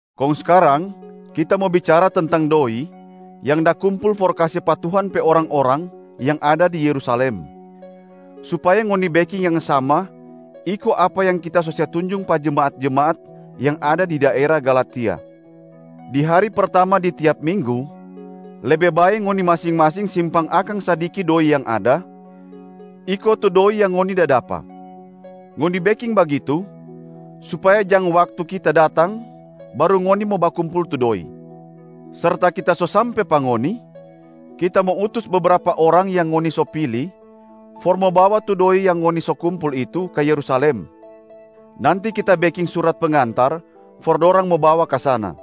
Kong skarang, kita mo bicara tentang doi yang da kumpul for kase pa Tuhan pe orang-orang yang ada di Yerusalem, supaya ngoni beking yang sama iko apa yang kita so se tunjung pa jemaat-jemaat yang ada di daera Galatia. Di hari pertama di tiap minggu, lebe bae ngoni masing-masing simpang akang sadiki doi yang ada iko tu doi yang ngoni da dapa. Ngoni beking bagitu supaya jang waktu kita datang baru ngoni mo bakumpul tu doi. Serta kita so sampe pa ngoni, kita mo utus bebrapa orang yang ngoni so pili for mo bawa tu doi yang ngoni so kumpul itu ka Yerusalem. Nanti kita beking surat pengantar for dorang mo bawa ka sana.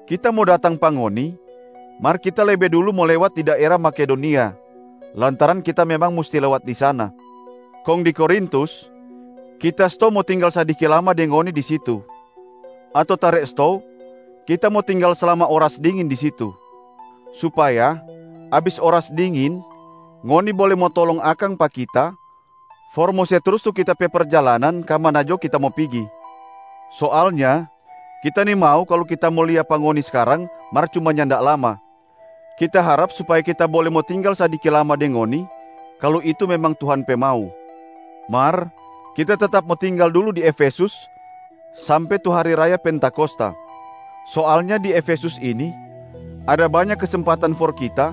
Kita mo datang pa ngoni, mar kita lebe dulu mo lewat di daera Makedonia lantaran kita memang musti lewat di sana. Kong di Korintus, kita stou mo tinggal sadiki lama deng ngoni di situ ato tare stou kita mo tinggal slama oras dingin di situ, supaya abis oras dingin ngoni bole mo tolong akang pa kita for mo se trus tu kita pe perjalanan ka mana jo kita mo pigi. Soalnya kita nimau kalu kita mo lia pa ngoni skarang mar cuma nyanda lama, kita harap supaya kita bole mo tinggal sadiki lama deng ngoni, kalu itu memang Tuhan pe mau. Mar kita tetap mo tinggal dulu di Efesus sampe tu hari raya Pentakosta. Soalnya di Efesus ini ada banya kesempatan for kita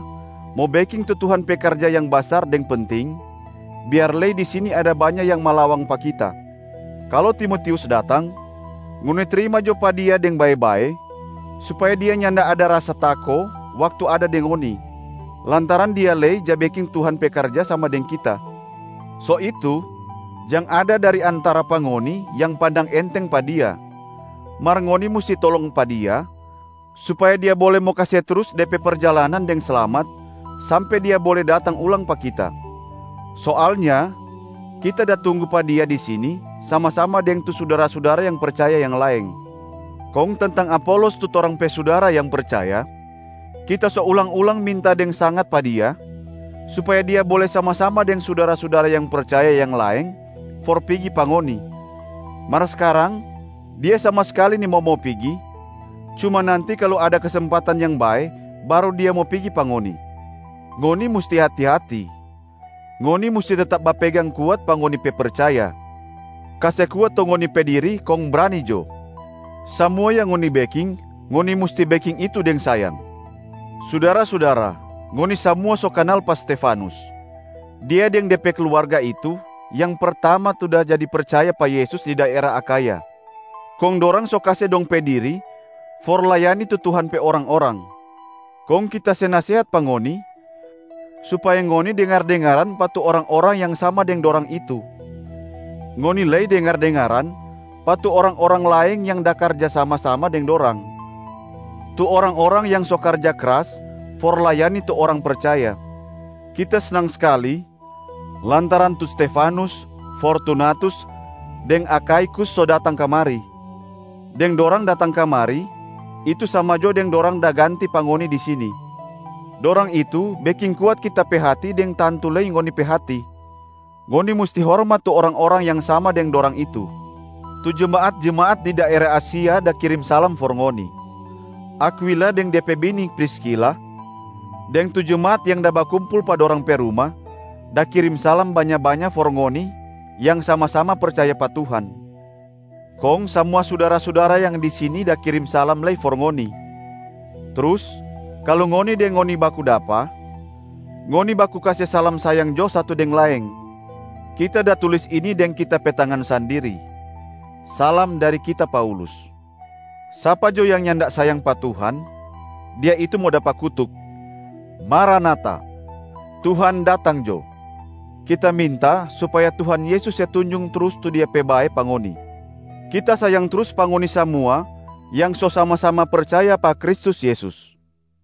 mo beking tu Tuhan pe karja yang basar deng penting, biar lei di sini ada banya yang malawang pa kita. Kalu Timotius datang, ngoni trima jo pa dia deng bae-bae supaya dia nyanda ada rasa tako waktu ada deng ngoni, lantaran dia lei ja beking Tuhan pe karja sama deng kita. So itu, jang ada dari antara pa ngoni yang pandang enteng pa dia, mar ngoni musti tolong pa dia, supaya dia bole mo kase trus de pe perjalanan deng slamat sampe dia bole datang ulang pa kita. Soalnya kita da tunggu pa dia di sini sama-sama deng tu sudara-sudara yang percaya yang laeng. Kong tentang Apolos tu torang pe sudara yang percaya, kita so ulang-ulang minta deng sangat pa dia, supaya dia bole sama-sama deng sudara-sudara yang percaya yang laeng for pigi pa ngoni. Mar skarang dia sama skali nimau mo pigi, cuma nanti kalu ada kesempatan yang bae baru dia mo pigi pa ngoni. Ngoni musti hati-hati, ngoni musti tetap bapegang kuat pa ngoni pe percaya! Kase kuat tu ngoni pe diri kong brani jo! Samua yang ngoni beking, ngoni musti beking itu deng sayang. Sudara-sudara, ngoni samua so kanal pa Stefanus. Dia deng de pe kluarga itu yang pertama tu da jadi percaya pa Yesus di daera Akhaya, kong dorang so kase dong pe diri for layani tu Tuhan pe orang-orang. Kong kita se nasehat pa ngoni, supaya ngoni dengar-dengaran pa tu orang-orang yang sama deng dorang itu. Ngoni lei dengar-dengaran pa tu orang-orang laeng yang da karja sama-sama deng dorang, tu orang-orang yang so karja kras for layani tu orang percaya. Kita snang skali lantaran tu Stefanus, Fortunatus deng Akhaikus so datang kamari. Deng dorang datang kamari, itu sama jo deng dorang da ganti pa ngoni di sini. Dorang itu beking kuat kita pe hati deng tantu lei ngoni pe hati. Ngoni musti hormat tu orang-orang yang sama deng dorang itu. Tu jemaat-jemaat di daera Asia da kirim salam for ngoni. Akwila deng de pe bini Priskila, deng tu jemaat yang da bakumpul pa dorang pe ruma da kirim salam banya-banya for ngoni yang sama-sama percaya pa Tuhan. Kong samua sudara-sudara yang di sini da kirim salam lei for ngoni. Trus kalu ngoni deng ngoni baku dapa, ngoni baku kase salam sayang jo satu deng laeng. Kita da tulis ini deng kita pe tangan sandiri: salam dari kita Paulus. Sapa jo yang nyanda sayang pa Tuhan, dia itu mo dapa kutuk. Maranata! Tuhan datang jo. Kita minta supaya Tuhan Yesus se tunjung trus tu Dia pe bae pa ngoni. Kita sayang trus pa ngoni samua yang so sama-sama percaya pa Kristus Yesus.